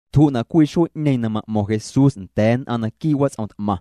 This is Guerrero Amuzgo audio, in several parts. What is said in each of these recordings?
Tju'na' cwii xuee'ñeeⁿ na ma'mo̱ⁿ Jesús nda̱a̱ nn'aⁿ naquii' wats'om t'maⁿ.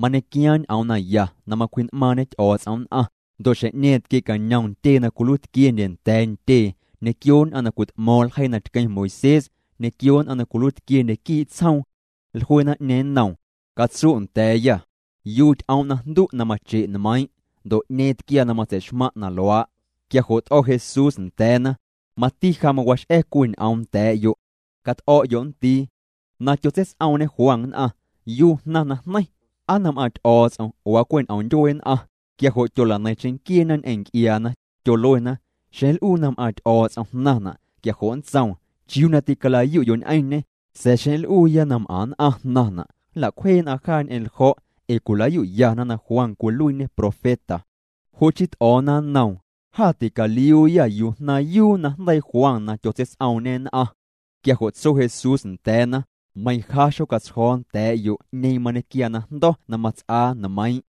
Mañequiaaⁿ ñ'oom naya na macwji'n'maaⁿñe Ty'o̱o̱ts'om nn'aⁿ, ndo' xjeⁿ'ñeeⁿ tquie'cañom ntyee na cwiluiitquiendye nda̱a̱ ntyee ñequio nn'aⁿ na cwit'mo̱o̱ⁿ ljeii na tqueⁿ Moisés, ñequio nn'aⁿ na cwiluiitquiendye quii' tsjoom. Jlue naⁿ'ñeeⁿ nnoom: —Catsu' nda̱a̱yâ, ¿yuu ty'om' najndu' na mache' nmeiiⁿ'? Ndo' ¿'ñeeⁿ tquiaa na matseixmaⁿ' na luaa'? Quia jo' t'o̱ Jesús nda̱a̱na: —Mati ja mawax'a̱ cwii ñ'oom nda̱a̱'yo'. Cat'o̱'yo' nndii. Na tyotseits'oomñe Juan nn'aⁿ, ¿yuu jnaⁿ najneiⁿ? ¿Aa nam'aaⁿ Ty'o̱o̱ts'om oo aa cwe' ñ'om ndyuee nn'aⁿ? Quia jo' tyola'neiⁿ cheⁿnquieena ñ'eⁿ nc'iaana, tyoluena: —Xeⁿ nl'uuya na m'aaⁿ Ty'o̱o̱ts'om jnaⁿna', quia jo' nntsoom: “¿Chiuu na tîcala'yu'yo' ñ'eⁿñê?” Sa̱a̱ xeⁿ nl'uuya nam'aⁿ nn'aⁿ jnaⁿna', nla'cwjee nn'aⁿ jaa ñ'eⁿ ljo̱', ee cwilayu'yana na Juan cwiluiiñê profeta. Jo' chii t'o̱o̱na nnoom: —Jâ ticaliuuyâ yuu jnaⁿyuu najndeii Juan na tyotseits'oomñê nn'aⁿ. Quia jo' tso Jesús nda̱a̱na: —Meiⁿ ja, xocatsjo̱o̱ nda̱a̱'yo' 'ñeeⁿ mañequiaa najndo̱ na mats'aa nmeiiⁿ'.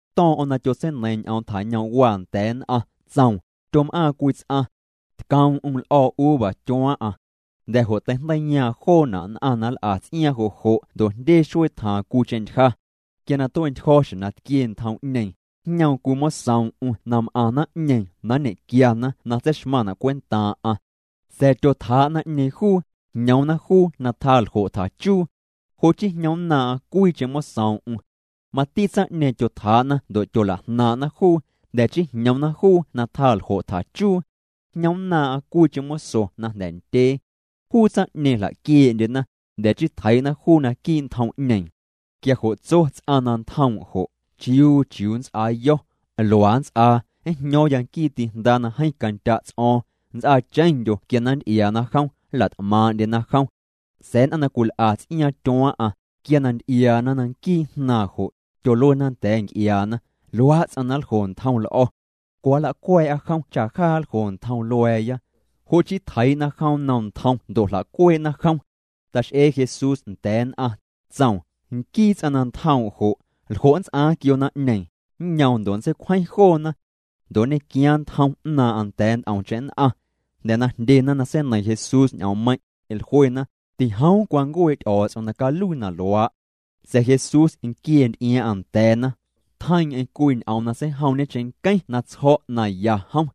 To̱o̱ⁿ'o̱ⁿ na tyotseineiiⁿ ñ'oom tjañoom'waa nda̱a̱ nn'aⁿ, tsoom: —Tyom'aaⁿ cwii ts'aⁿ. Tcoom'm l'o̱o̱ uva tyuaaⁿ'aⁿ. Jnda̱ jo' teijndeiiyaaⁿ joona' nn'aⁿ na nl'a ts'iaaⁿ jo' jo' ndo' jndye xuee tjaaⁿ cwiicheⁿ ntyja. Quia na tue'ntyjo̱ xjeⁿ na tquie ntjom'ñeeⁿ, jñoom cwii mosoom'm na m'aⁿ naⁿ'ñeeⁿ na nñe'quiana na tseixmaⁿ cwentaaⁿ'aⁿ. Sa̱a̱ tyotjaa' naⁿ'ñeeⁿ juu, jñoomna juu na tjaa ljo' tjachuu. Jo' chii jñomnnaaⁿ'aⁿ cwiicheⁿ mosoom'm. Mati tsaⁿ'ñeeⁿ tyotjaa'na ndo' tyolajnaaⁿ'na juu, jnda̱ chii jñoomna juu na tjaa ljo' tjachuu. Jñomnnaaⁿ'aⁿ cwiicheⁿ moso na jnda̱ ndyee. Juu tsaⁿ'ñeeⁿ jla'quiee'ndyena, jnda̱ chii tjeii'na juu naquii' ntjom'ñeeⁿ. ’Quia jo' tso ts'aⁿ na ntjoom' jo': “¿Chiuu chiuu nnts'aayo̱? Luaa nnts'aa, njño̱o̱ⁿ nquii ti'jndaa na jeeⁿ candya' ts'o̱o̱ⁿ. Nnts'aacheⁿndyo quia na nnty'iaana jom, nla't'maaⁿ'ndyena jom.” Sa̱a̱ nn'aⁿ na cwil'a ts'iaaⁿ tyuaaⁿ'aⁿ, quia na nty'iaana na nquii jnaaⁿ jo', tyoluena nda̱a̱ nc'iaana: “Luaa' ts'aⁿ na cwiljo ntjom l'o̱. Cwa nla'cua̱a̱'a jom cha jaa nljo ntjom lua̱a̱ya.” Jo' chii, tjeii'na jom nnom ntjom ndo' jla'cuee'na jom. Tax'ee Jesús nda̱a̱ nn'aⁿ, tsoom: —Nquii ts'aⁿ na ntjoom' jo', ¿ljo' nts'aaⁿ quio naⁿ'ñeeⁿ? Nñoom ndo' nntseicwjeⁿ joona. Ndo' nñe'quiaaⁿ ntjom 'naaⁿ'aⁿ nda̱a̱ nt'omcheⁿ nn'aⁿ. Jnda̱ na jndyena na seineiⁿ Jesús ñ'oommeiⁿ', jluena: —Tijoom cwancuee' Ty'o̱o̱ts'om na caluii na luaa'. Sa̱a̱ Jesús nquiee nty'iaaⁿ'aⁿ nda̱a̱na. Tjeiiⁿ'eⁿ cwii ñ'oom na seijoom'ñe cheⁿnqueⁿ na tsjo̱' na ya jom.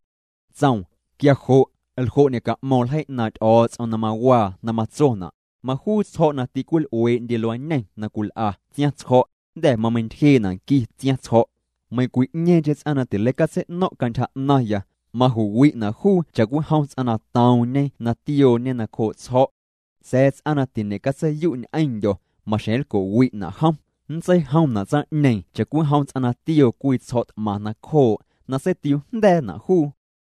Tsoom: —Quia jo' ¿ljo' ñe'ca'mo̱ⁿ ljeii 'naaⁿ' Ty'o̱o̱ts'om na mawaa na matsona'?: Majuu tsjo̱' na tîcwil'uee'ndye luañeⁿ na cwil'a tsiaⁿtsjo̱', jnda̱ mameiⁿntyjee'na' nqui tsiaⁿtsjo̱'. Meiⁿcwi'ñeeⁿcheⁿ ts'aⁿ na tileicatsei'no̱ⁿ' cantyja 'naⁿya, maju'wi'na' juu cha'cwijom ts'aⁿ na toomñe na tiooñe nacjoo' tsjo̱'. Sa̱a̱ ts'aⁿ na tiñe'catseiyu' ñ'eⁿndyo̱, maxjeⁿ nlco'wi'na' jom. Nntseijomna' tsaⁿ'ñeeⁿ cha'cwijom ts'aⁿ na tioo cwii tsjo̱' t'maⁿ nacjoo', na seitiuujnda̱a̱na' juu.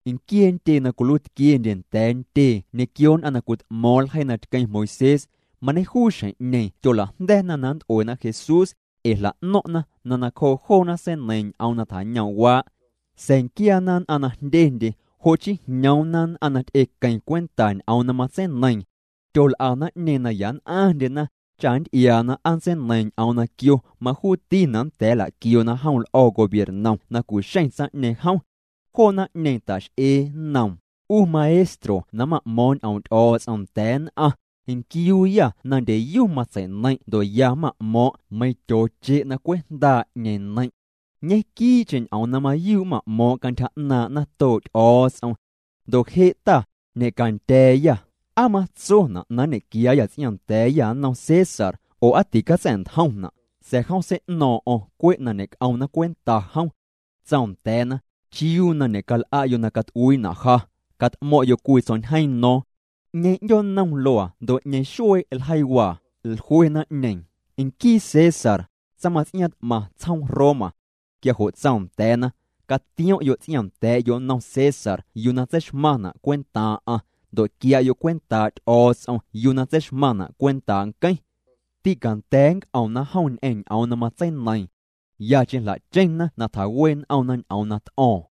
Nquiee ntyee na cwiluiitquiendye nda̱a̱ ntyee ñequio nn'aⁿ na cwit'mo̱o̱ⁿ ljeii na tqueⁿ Moisés, mañejuu xjeⁿ'ñeeⁿ tyola'jnda̱na na nnt'uena Jesús, ee jla'no̱ⁿ'na na nacjoo joona seineiiⁿ ñ'oom na tjañoom'waa'. Sa̱a̱ nquiaana nn'aⁿ na jndyendye, jo' chii jñoomna nn'aⁿ na ty'equeⁿ cwenta ñ'oom na matseineiiⁿ. Tyol'a naⁿ'ñeeⁿ na ya nn'aⁿndyena, cha nnty'iaana aa nntseineiiⁿ ñ'oom na quio majuutina' nnda̱a̱ nla'quioona jom l'o̱ gobiernom na cu'xeⁿ tsaⁿ'ñeeⁿ jom. Joo naⁿ'ñeeⁿ ta'x'ee nnoom: —'U Maestro na ma'mo̱o̱ⁿ' ñ'oom' Ty'o̱o̱ts'om nda̱a̱ nn'aⁿ, nquiuuyâ na ndyeyu matsei'neiⁿ' ndo' ya ma'mo̱o̱ⁿ' meiⁿ tyooche' na cwe' jndaa' 'ñeeⁿ neiⁿ'. Ñe'quii'cheⁿ ñ'oom na mayuu' ma'mo̱o̱ⁿ' cantyja 'naaⁿ' natoo' Ty'o̱o̱ts'om. Ndo' je' Ta, ñe'candya̱a̱yâ, ¿aa matsona' na nñe'quiaayâ ts'iaaⁿnda̱a̱yâ nnom César, oo aa ticatsa̱'ntjomna'? Sa̱a̱ jom sei'no̱o̱ⁿ'o̱ⁿ cwe' na ñe'c'omna cwenta jom. Tsoom nda̱a̱na: —¿Chiuu na ñe'cal'a'yo' na cat'uiina' ja? Cat'mo̱ⁿ'yo' cwii tsjo̱'ñjeeⁿ no̱o̱ⁿ. ¿'Ñeeⁿ 'ndyoonnom luaa ndo' 'ñeeⁿ xuee' ljeiiwaa? Jlue naⁿ'ñeeⁿ: —Nquii César, tsaⁿmaⁿts'iaaⁿ t'maⁿ tsjoom Roma. Quia jo' tsoom nda̱a̱na: —Catiom'yo' ts'iaaⁿnda̱a̱'yo' nnom César yuu na tseixmaⁿna' cwentaaⁿ'aⁿ, ndo' quia'yo' cwentaa' Ty'o̱o̱ts'om yuu na tseixmaⁿna' cwentaa' nqueⁿ. Tîcanda̱a̱ nnc'omna jom ñ'eⁿ ñ'oom na matseineiiⁿ. Yacheⁿ jla'cheⁿna na tjawee' n'omna ñ'oom na t'o̱o̱ⁿ.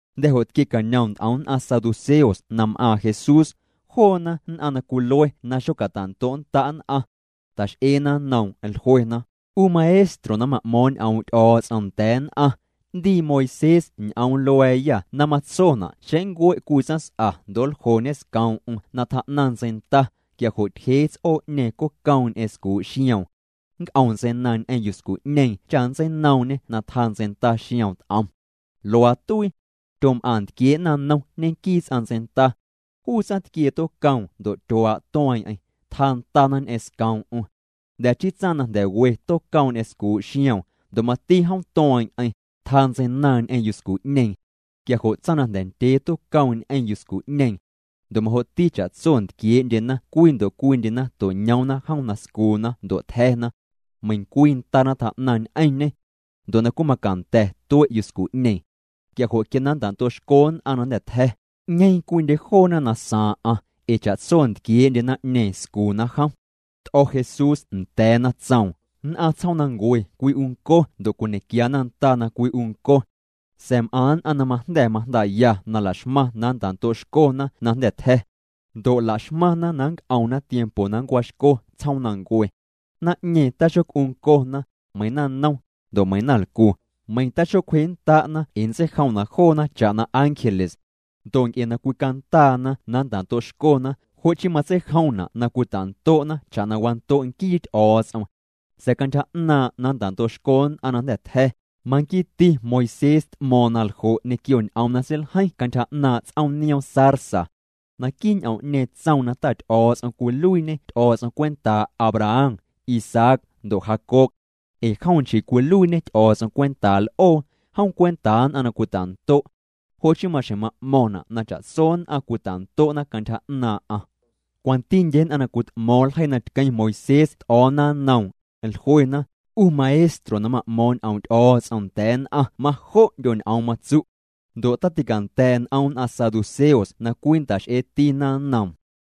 Jnda̱ jo' tquie'cañom nt'om nn'aⁿ saduceos nam'aaⁿ Jesús. Joona nn'aⁿ na cwilue na xocata'ndo'nnda' nn'aⁿ. Ta'x'eena nnoom, jluena: —'U Maestro na ma'mo̱o̱ⁿ' ñ'oom' Ty'o̱o̱ts'om nda̱a̱ nn'aⁿ, 'ndii Moisés ñ'oom lua̱a̱yâ na matsona' xeⁿ nncue' cwii tsaⁿs'a ndo' nljoñe scoom'm na tjaa'naⁿ ntseinda, quia jo' tyjee ts'oo'ñeeⁿ cocoom ñ'eⁿ scuu' xioom. Nnc'om ntseinaaⁿ ñ'eⁿ yuscu'ñeeⁿ cha nntseinoomñê na tjaa ntseinda xioom t'om. Luaa tuii. Tyom'aⁿ ntquiee' naⁿnom ñenquii ts'aⁿ ntseinda. Juu tsaⁿtquiee tocoom ndo' tyuaa' tueeⁿ'eⁿ, tjaa ndana ñ'eⁿ scoom'm. Jnda̱ chii tsaⁿ na jnda̱ we tocoom ñ'eⁿ scuu' xioom, ndo' mati jom tueeⁿ'eⁿ, tjaa ntseinaaⁿ ñ'eⁿ yuscu'ñeeⁿ. Quia jo' tsaⁿ na jnda̱ ndyee tocoom ñ'eⁿ yuscu'ñeeⁿ. Ndo' majo'ti cha'tso ntquiee'ndyena cwii ndo' cwiindyena to'ñoomna jom na scuuna ndo' tja̱na. Meiⁿcwii ndana tjaa'naⁿ ñ'eⁿñê. Ndo' na cwiimacanda̱ tue' yuscu'ñeeⁿ. Quia jo' quia na nnta'ndo'xco nn'aⁿ na jnda̱ tja̱, ¿'ñeeⁿ cwiindye joona na saaⁿ'aⁿ? Ee cha'tso ntquiee'ndye naⁿ'ñeeⁿ scuuna jom. T'o̱ Jesús nda̱a̱na, tsoom: —Nn'aⁿ tsjoomnancue cwi'unco ndo' cwiñe'quia nda na cwi'unco. Sa̱a̱ m'aⁿ nn'aⁿ na majnda̱ majndaa'ya na la'xmaⁿ na nnta'ndo'xcona na jnda̱ tja̱. Ndo' la'xmaⁿna na nnc'omna tiempo na nncuaaxco tsjoomnancue. Naⁿ'ñeeⁿ taxoc'uncona, meiⁿ naⁿnom, ndo' meiⁿ naⁿlcu. Meiⁿ taxocwjennda'na ee nntseijomna' joona cha'na ángeles. Ndo' nc'e na cwicandaana na nnta'ndo'xcona, jo' chii matseijomna' na cwita'ndo'na cha'na wando' nquii Ty'o̱o̱ts'om. Sa̱a̱ cantyja 'naaⁿ' na nnta'ndo'xco nn'aⁿ na jnda̱ tja̱, maquiiti Moisés t'mo̱o̱ⁿ na ljo' ñequio ñ'oom na seiljeiⁿ cantyja 'naaⁿ' ts'oom nioom zarza. Naquii' ñ'oom'ñeeⁿ tsoom na Ta Ty'o̱o̱ts'om cwiluiiñê Ty'o̱o̱ts'om cwentaa' Abraham, Isaac, ndo' Jacob. Ee jom nchii cwiluiiñê Ty'o̱o̱ts'om cwentaa l'oo, jom cwentaa nn'aⁿ na cwita'ndo'. Jo' chii maxjeⁿ ma'mo̱ⁿna' na cha'tso nn'aⁿ cwita'ndo'na cantyja 'naaⁿ'aⁿ. Cwantindye nn'aⁿ na cwit'mo̱o̱ⁿ ljeii na tqueⁿ Moisés t'o̱o̱na nnoom, jluena: —'U Maestro na ma'mo̱o̱ⁿ' ñ'oom' Ty'o̱o̱ts'om nda̱a̱ nn'aⁿ majo'ndyo ñ'oom matsu'. Ndo' taticanda̱a̱' n'om nn'aⁿ saduceos na cwii nnta'x'eetina nnoom.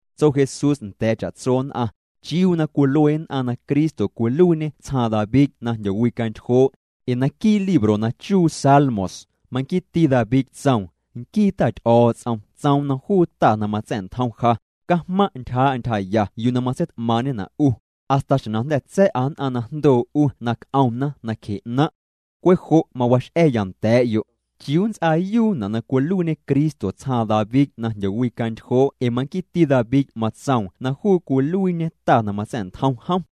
Tso Jesús nda̱a̱ cha'tso nn'aⁿ: —¿Chiuu na cwilue nn'aⁿ na Cristo cwiluiiñê tsjaaⁿ David na jndyowicantyjoo'? Ee naquii' libro na chuu Salmos, maquiiti David tsoom: Nquii Ta Ty'o̱o̱ts'om tsoom nnom juu Ta na matsa̱'ntjom ja: “Cajmaⁿ' ntyjaa'a ntyjaya yuu na matseit'maaⁿ'ñena' 'u, hasta xjeⁿ na jnda̱ tsa̱'a nn'aⁿ na jndoo 'u na c'omna nacje 'naⁿ'.” Cwe' jo' mawax'a̱ya nda̱a̱'yo': —¿Chiuu nnts'aayuuna' na cwiluiiñe Cristo tsjaaⁿ David na jndyowicantyjoo' ee manquiiti David matsoom na juu cwiluiiñe Ta na matsa̱'ntjom jom?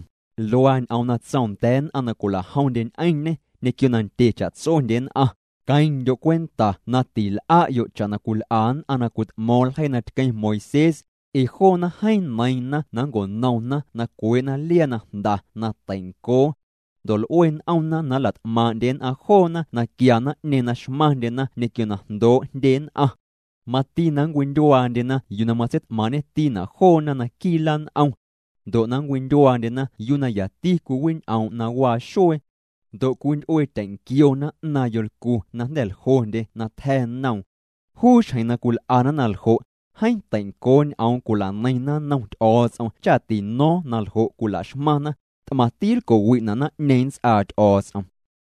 Luaa ñ'oom na tsoom nda̱a̱ nn'aⁿ na cwila'jomndye ñ'eⁿñê, ñequio na ndye cha'tsondye nn'aⁿ: —Queⁿndyo' cwenta na til'a'yo' cha'na cwil'a nn'aⁿ na cwit'mo̱o̱ⁿ ljeii na tqueⁿ Moisés, ee joona jeeⁿ neiiⁿna na nnco'nomna na cwee'na liaa na jnda na tei'ncoo. Ndo' l'ue n'omna na nla't'maaⁿ'ndye nn'aⁿ joona na quia naⁿ'ñeeⁿ na xmaⁿndyena ñequio na jndoo' jndye nn'aⁿ. Mati na nncwindyuaandyena yuu na matseit'maaⁿ'ñetina' joona naquii' lan'om. Ndo' na nncwindyuaandyena yuu na yati cwiwiñ'oom' na waa xuee. Ndo' cwinty'uetyeⁿnquiona 'naaⁿ yolcu na jnda̱ ljondye na tja̱ noom. Juu xjeⁿ na cwil'ana na ljo', jeeⁿ teincoo ñ'oom cwila'neiⁿna nnom Ty'o̱o̱ts'om cha tino̱o̱ⁿ na ljo' cwila'xmaⁿna. T'maⁿti lco'wi'na' naⁿ'ñeeⁿ nnts'aa Ty'o̱o̱ts'om.